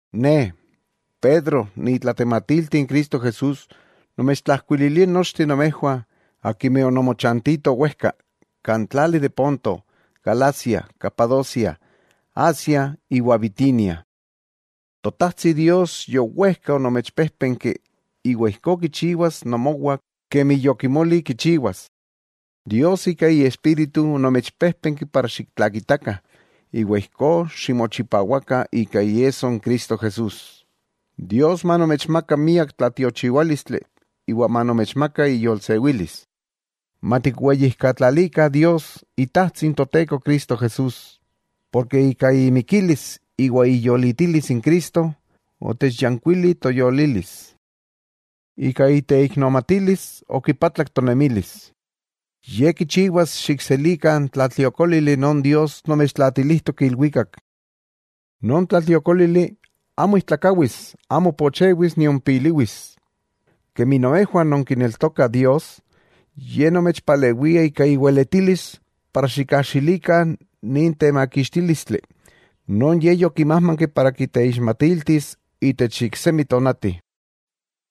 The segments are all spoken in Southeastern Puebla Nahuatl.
Ne, Pedro ni itlatematilti n Cristo Jesús, nomechtlajkuililia nochteh nomejwah, akimeh ononmochantitoh wejka, kan tlali de Ponto, Galacia, Capadocia, Asia iwa Bitinia. Totajtsi Dios yowejka onomechpéjpenki iwa ijkó kichiwas nomowah kemi yokimoli kichiwas. Dios ika Iespíritu onomechpéjpenki para xiktlakitakah iwa ijkó ximochipawakah ika iesso n Cristo Jesús. Dios manomechmaka miak tlatiochiwálistli iwa manomechmaka iyolsewilis. Matikweyijkatlalikah Dios Itajtsi n Toteko Cristo Jesús, porke ika imikilis iwa iyolitilis n Cristo, otechyankuili toyolilis. Ika iteiknomatilis okipatlak tonemilis. Ye kichiwas xikselikah n tlatliokólili non Dios nomechtlaatilijtok ilwikak. Non tlatliokólili amo ijtlakawis, amo pochewis, nion piliwis. Kemi nomejwah nonkineltokah Dios, Ye nomechpalewia ika iweletilis para xikajxilikah nin temakixtílistli non Ye yokimájmanki para kiteixmatiltis intech iksemi tonati.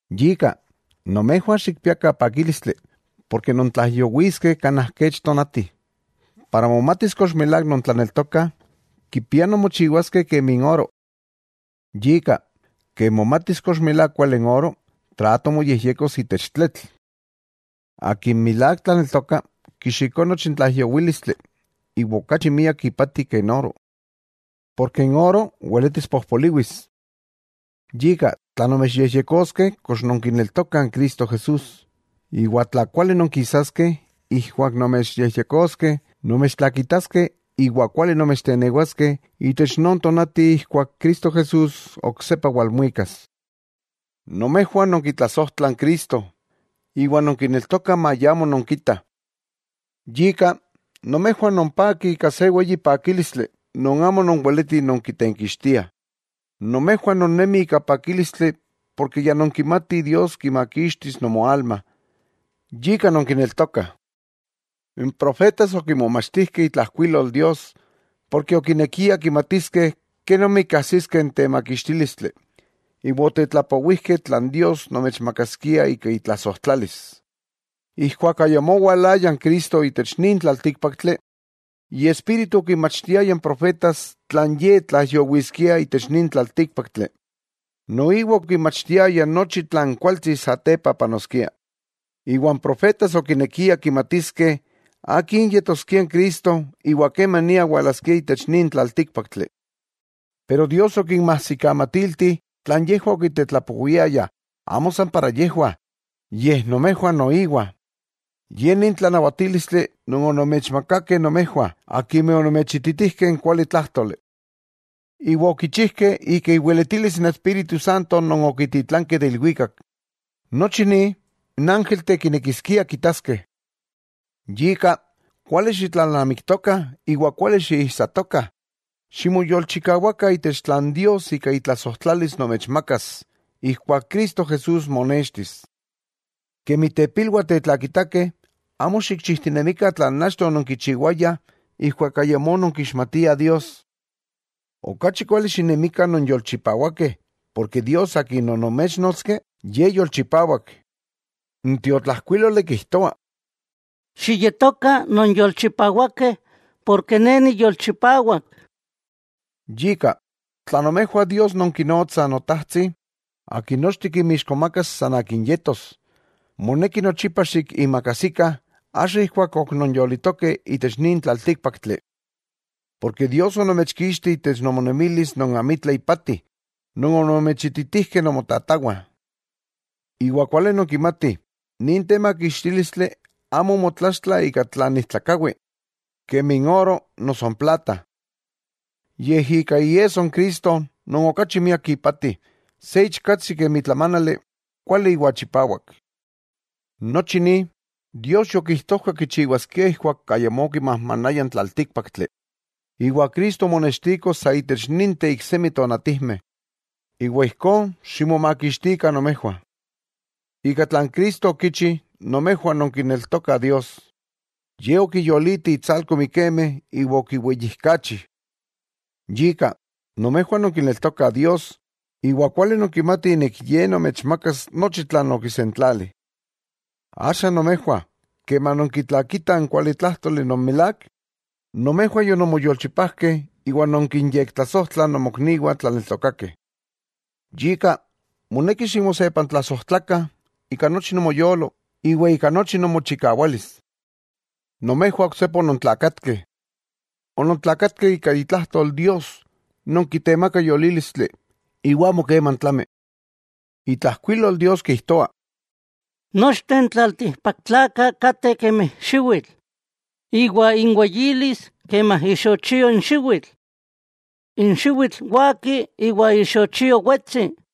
Yika, nomejwah xikpiakah pakílistli, porke nontlaijyowiskeh kanaj kech tonatih. Para momatis kox milák nontlaneltokah, kipiah nonmochiwaskeh kemi n oro. Yika, ken momatis kox milák kuali n oro, trato moyejyekos itech tletl. Akin milák tlaneltoka, kixikoa nochi n tlaijyowílistli, iwa okachi miak ipati ke n oro, porke n oro weletis pojpoliwis. Yika, tla nomechyejyekoskeh kox nonkineltokah n Cristo Jesús, iwa tla kuali nonkisaskeh ijkuak nomechyejyekoskeh, nomechtlakitaskeh iwa kuali nomechtenewaskeh itech non tonati ijkuak Cristo Jesús oksepa walmuikas. Nomejwah nonkitlasojtlah n Cristo, iwa nonkineltokah maya amo nonkitah. Yika, nomejwah nonpakih ika se weyi pakílistli non amo nonweletih nonkitenkixtiah, nomejwah nonnemi ika pakílistli porke ya nonkimatih Dios kimakixtis nomoalma, yika nonkineltokah. N profetas okimomachtijkeh itlajkuilol Dios, porke okinekiah kimatiskeh kenomi kajsiskeh n temakixtílistli, iwa otetlapowijkeh tlan Dios nomechmakaskia ika itlasojtlalis. Ijkuak ayamó owalaya n Cristo itech nin tlaltíkpaktli, Iespíritu okinmachtiaya n profetas tlan Ye tlaijyowiskia itech nin tlaltíkpaktli, noiwa okinmachtiaya nochi tlan kualtsi satepa panoskia. Iwa n profetas okinekia kimatiskeh akin yetoskia n Cristo iwa kemania walaskia itech nin tlaltíkpaktli. Pero Dios okinmajsikamatilti tlan yejwah okitetlapowiayah amo san para yejwah, yej nomejwah noiwa. Ye ni n tlanawatílistli non onomechmakakeh nomejwah akimeh onomechititijkeh n kuali tlájtoli. Iwa okichijkeh ika iweletilis n Espíritu Santo non okititlankeh de ilwikak. ¡Nochi ni n ángelteh kinekiskia kitaskeh! Yika, kuali xitlalnamiktokah, iwa kuali xiijsatokah. Ximoyolchikawakah itech tlan Dios ika itlasojtlalis nomechmakas ijkuak Cristo Jesús monextis. Kemi tepilwah tetlakitakeh, amo xikchijtinemikah tlan achto ononkichiwayah ijkuak ayamó ononkixmatiah Dios. Okachi kuali xinemikah non yolchipawakeh, porke Dios Akin onomechnotski, Ye yolchipawak. N tiotlajkuíloli kijtoa: “Xiyetokah nonyolchipawakeh, porke Ne niyolchipawak.” Yika, tla nomejwah Dios nonkinotsah “Notajtsi” Akin nochteh kinmixkomakas san akin yetos, moneki nochipa xikiimakajsikah axa ijkuak ok nonyolitokeh itech nin tlaltíkpaktli. Dios onomechkixti itech nomonemilis non amitla ipati non onomechititijkeh nonmotatawah. Iwa kuali nonkimatih nin temakixtílistli amo omotlaxtla ika tlan ijtlakawi, kemi n oro noso n plata, yej ika iesso n Cristo non okachi miak ipati, se ichkatsi kemi tlamánali, kuali iwa chipawak. Nochi ni, Dios yokijtojka kichiwaskia ijkuak ayamó okimajmanaya n tlaltíkpaktli, iwa Cristo omonextiko sa itech ninteh iksemi tonatijmeh, iwa ijkó ximomakixtikah nomejwah. Ika tlan Cristo okichi nomejwah nonkineltokah Dios, Ye okiyoliti intsalko mikemeh iwa okiweyijkachi. Yika, nomejwah nonkineltokah Dios, iwa kuali nonkimatih Ye nomechmakas nochi tlan okisentlali. Axa nomejwah keman nonkitlakitah n kualitlájtoli non milák, nomejwah yononmoyolchipajkeh iwa nonkinyektlasojtlah nomokniwah tlaneltokakeh. Yika, moneki ximosepantlasojtlakah ika nochi nomoyolo, iwa ika nochi nomochikawalis. Nomejwah oksepa onontlakatkeh. Onontlakatkeh ika itlajtol Dios non kitemaka yolílistli iwa amo keman tlami. Itlajkuilol Dios kijtoa: Nochteh n tlaltikpaktlakah kateh kemi xiwitl, iwa inweyilis kemi ixochio n xiwitl. N xiwitl waki iwa ixochio wetsi,